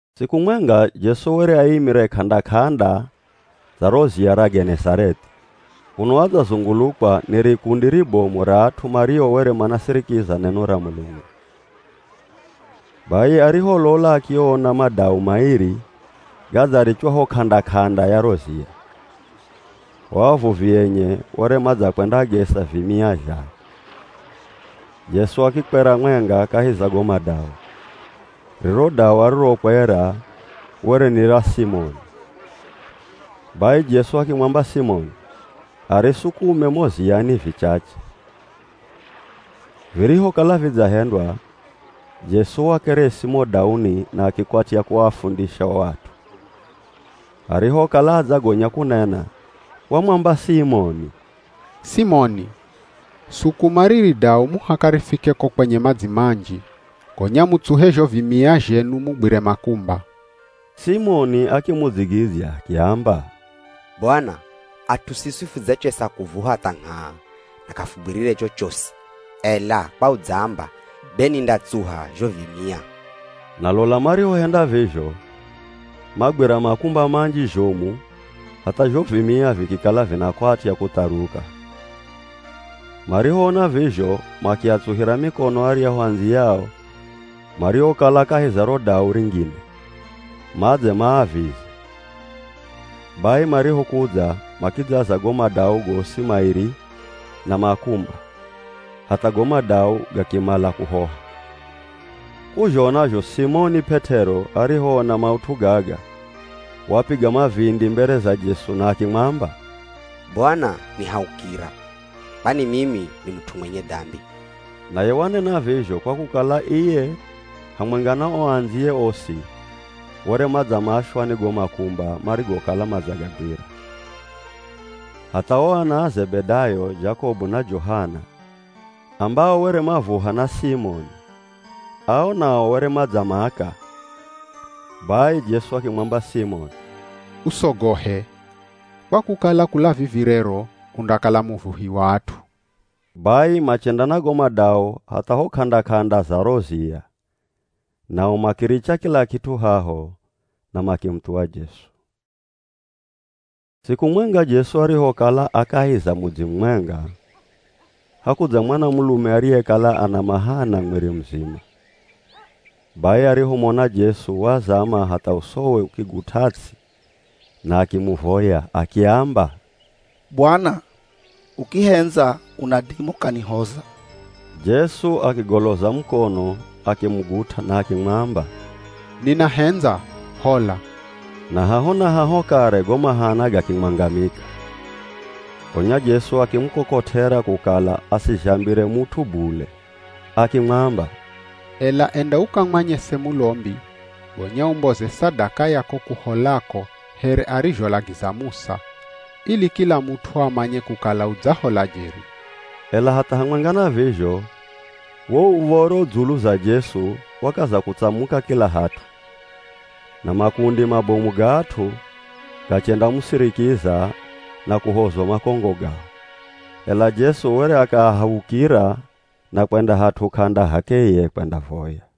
Siku mwenga Jesu were aimire k'anda-k'anda za ro ziya ra Genezarethi kuno adzazungulukwa ni rikundi ribomu ra at'u mario were manasirikiza neno ra Mulungu. Bai ariholola akiona madau mairi gadzarichwa ho k'anda-k'anda ya ro ziya. O avuvi enye were madzakwendagesa vimia zhao. Jesu akikwera mwenga kahi za go madau. Riro dau arirokwera were ni ra Simoni. Bai Jesu akimwamba Simoni arisukume mo ziyani vichache, virihokala vidzahendwa, Jesu wakeresi mo dauni na akikwatya kuafundisha o at'u. Arihokala adzagonya kunena wamwamba Simoni, “Simoni, sukuma riri dau muhaka rifike ko kwenye madzi manji, gonya mutsuhe zho vimia zhenu mugwire makumba.” Simoni akimudzigidzya akiamba, “Bwana! At'u siswi fudzachesa kuvuha tha ngh'aa na k'afugwirire chochosi, ela kwa udzaamba, be nindatsuha zho vimia.” Na lola marihohenda vizho, magwira makumba manji zhomu hatha zho vimia vikikala vinakwatya kutharuka. Marihoona vizho makiatsuhira mikono aryahu andziyao mariokala kahi za ro dau ringine, madze maavize. Bai marihokudza, makidzaza go madau gosi mairi na makumba, hatha go madau gakimala kuhoha. K'uzhona zho ye Simoni P'et'ero arihoona maut'u gaga, wapiga mavindi mbere za Jesu na akimwamba, “Bwana nihaukira, kwani mimi ni mut'u mwenye dambi!” Naye wanena vizho kwa kukala iye hamwenga na o andziye osi were madzamashwa ni go makumba marigokala madzagagwira. Hatha o ana a Zebedayo, Jakobu na Johana ambao were mavuha na Simoni, ao nao were madzamaka. Bai Jesu akimwamba Simoni, “Usogohe, kwa kukala kula vivi rero, undakala muvuhi wa at'u.” Bai machenda na go madau hatha ho k'anda-k'anda za ro ziya, nao makiricha kila kit'u haho na makimuthuwa Jesu. Siku mwenga, Jesu arihokala a kahi za mudzi mumwenga, hakudza mwanamulume ariyekala ana mahana mwiri muzima. Bai arihomona Jesu wazama hatha usowe ukigut'a ts'i na akimuvoya akiamba, “Bwana, ukihendza unadima ukanihoza!” Jesu akigoloza mukono akimugut'a na akimwamba, “Ninahendza, hola” Na haho na haho kare go mahana gakimwangamika. Gonya Jesu akimukokot'era kukala asizhambire mut'u bule, akimwamba, “Ela enda ukamwanyese mulombi, gonya umboze sadaka ya ko kuholako here arizholagiza Musa, ili kila mut'u amanye kukala udzahola jeri.” Ela hatha hamwenga na vizho, wo uv̱oro dzulu za Jesu wakaza kutsamuka kila hat'u, na makundi mabomu ga at'u gachendamusirikiza na kuhozwa makongo gao. Ela Jesu were akaahaukira na kwenda hat'u k'anda h'akeye kwendavoya.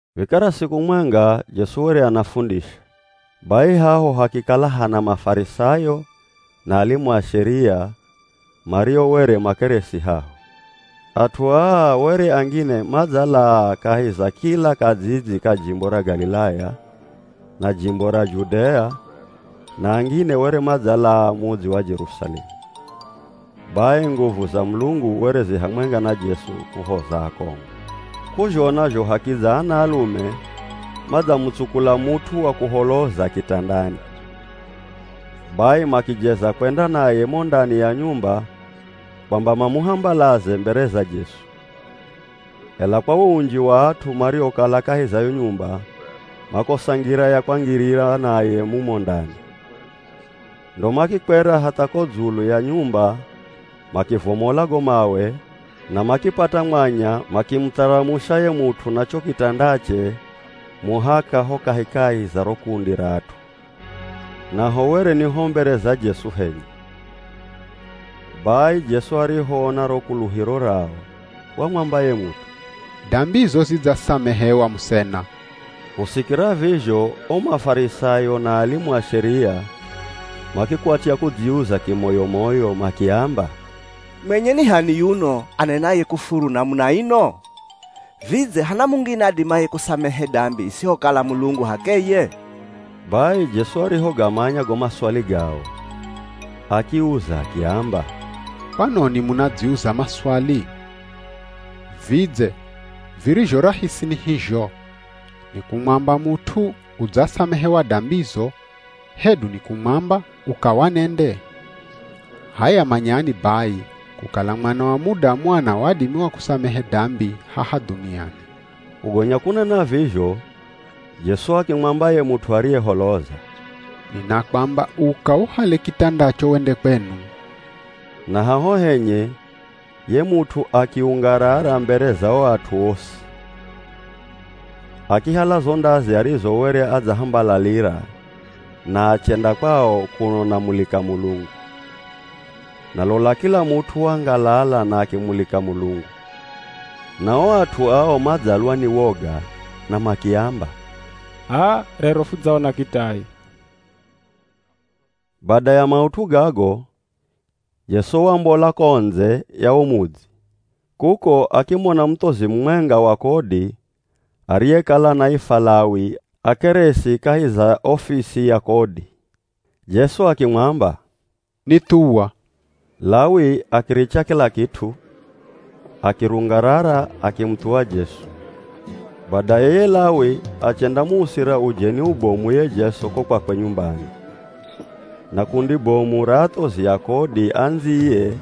Vikara siku mwenga Jesu were anafundisha, bai haho hakikala hana Mafarisayo na alimu a Sheria mario were makeresi haho. At'u aa were angine madzalaa kahi za kila kadzidzi ka jimbo ra Galilaya, na jimbo ra Judea na angine were madzalaa mudzi wa Jerusalemu. Bai nguvu za Mulungu were zi hamwenga na Jesu kuhoza akongo. K'uzhona zho hakidza anaalume madzamutsukula mut'u wa kuholoza kitandani. Bai makijeza kwenda naye mo ndani ya nyumba kwamba mamuhambalaze mbere za Jesu. Ela kwa wo unji wa at'u mariokala kahi za yo nyumba makosa ngira ya kwangirira naye mumo ndani. Ndo makikwera hatha ko dzulu ya nyumba makivomola go mawe na makipata mwanya makimutharamusha ye mut'u na cho kitandache muhaka ho kahikahi za ro kundi ra at'u, naho were ni ho mbere za Jesu henye. Bai Jesu arihoona ro kuluhiro rao, wamwamba ye mut'u, “Dambizo zidzasamehewa, musena!” Kusikira vizho o Mafarisayo na alimu a Sheria makikwatya kudziuza kimoyo-moyo makiamba, “Mwenye ni h'ani yuno, anenaye kufuru namuna ino? Vidze hana mungine adimaye kusamehe dambi isihokala Mulungu h'akeye?” Bai Jesu arihogamanya go maswali gao, akiuza akiamba, “Kwanoni munadziuza maswali? Vidze virizho rahisi ni hizho? Ni kumwamba mut'u ‘Udzasamehewa dambizo,’ hedu ni kumwamba, ‘Uka wanende?’ H'aya manyani bai, kukala Mwana wa Mudamu ana wadimi wa kusamehe dambi haha dhuniani.” Kugonya kunena vizho Jesu akimwamba ye mut'u ariyeholoza, “Ninakwamba uka uhale kitandacho wende kwenu.” Na haho henye ye mut'u akiungarara mbere za o at'u osi, akihala zo ndazi arizo were adzahambalalira na achenda kwao kuno anamulika Mulungu. Na lola, kila mut'u wangalala na akimulika Mulungu. Nao o at'u ao madzalwa ni woga na makiamba, “H'aa, rero fudzaona kitai.” Bai bada ya maut'u gago Jesu wambola ko ndze ya wo mudzi, kuko akimona muthozi mumwenga wa kodi ariyekala anaifwa Lawi akeresi kahi za ofisi ya kodi. Jesu akimwamba, “Nithuwa.” Lawi akiricha kila kit'u, akirungarara akimuthuwa Jesu. Badaye ye Lawi achendamuusira ujeni ubomu ye Jesu ko kwakwe nyumbani, na kundi bomu ra athozi a kodi andziye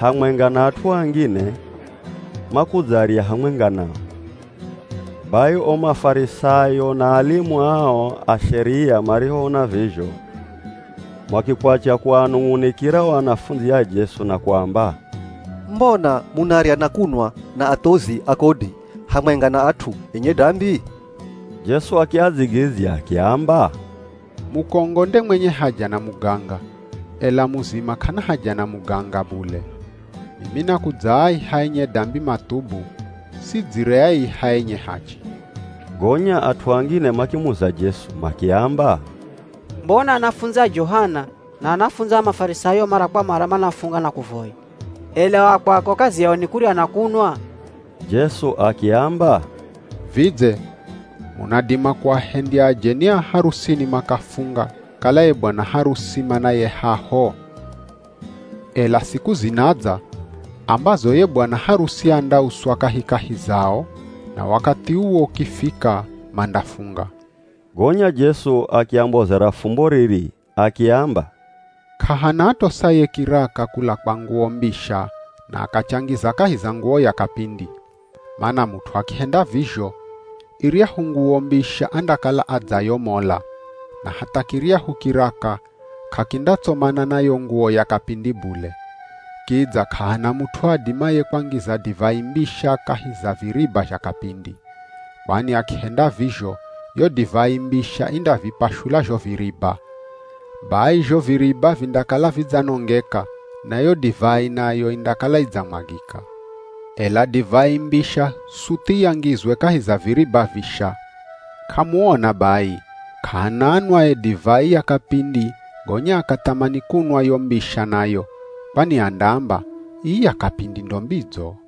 hamwenga na at'u angine, makudzarya hamwenga nao. Bai o Mafarisayo na alimu ao a Sheria marihoona vizho makikwatya kuanung'unikira o anafundzi a Jesu na kuamba, “Mbona munarya na kunwa na athozi a kodi, hamwenga na at'u enye dambi?” Jesu akiadzigidzya akiamba, “Mukongo nde mwenye haja na muganga, ela muzima k'ana haja na muganga bule. Mimi nakudzaaiha enye dambi mathubu, sidzireaiha enye hachi!” Gonya at'u angine makimuza Jesu makiamba, “Mbona anafundzi a Johana, na anafundzi a Mafarisayo mara kwa mara manafunga na kuvoya, ela o a kwako kazi yao ni kurya na kunwa?” Jesu akiamba, “Vidze munadima kuahendya ajeni a harusini makafunga kala ye bwana harusi manaye haho? Ela siku zinadza, ambazo ye bwana harusi andauswa kahikahi zao, na wakathi uwo ukifika mandafunga.” Gonya Jesu akiambozera fumbo riri, akiamba, “K'ahana atosaye kiraka kula kwa nguwo mbisha na akachangiza kahi za nguwo ya kapindi. Mana mut'u akihenda vizho, iryahu nguwo mbisha andakala adzayomola, na hatha kiryahu kiraka k'akindatsomana na yo nguwo ya kapindi bule. Kidza k'ahana mut'u adimaye kwangiza divai mbisha kahi za viriba zha kapindi. Kwani akihenda vizho yo divai mbisha indavipashula zho viriba. Bai zho viriba vindakala vidzanongeka, na yo divai nayo indakala idzamwagika. Ela divai mbisha suthi yangizwe kahi za viriba visha. K'amuona bai, k'ahana anwaye divai ya kapindi gonya akathamani kunwa yo mbisha nayo, kwani andaamba, ‘Ii ya kapindi ndo mbidzo.’”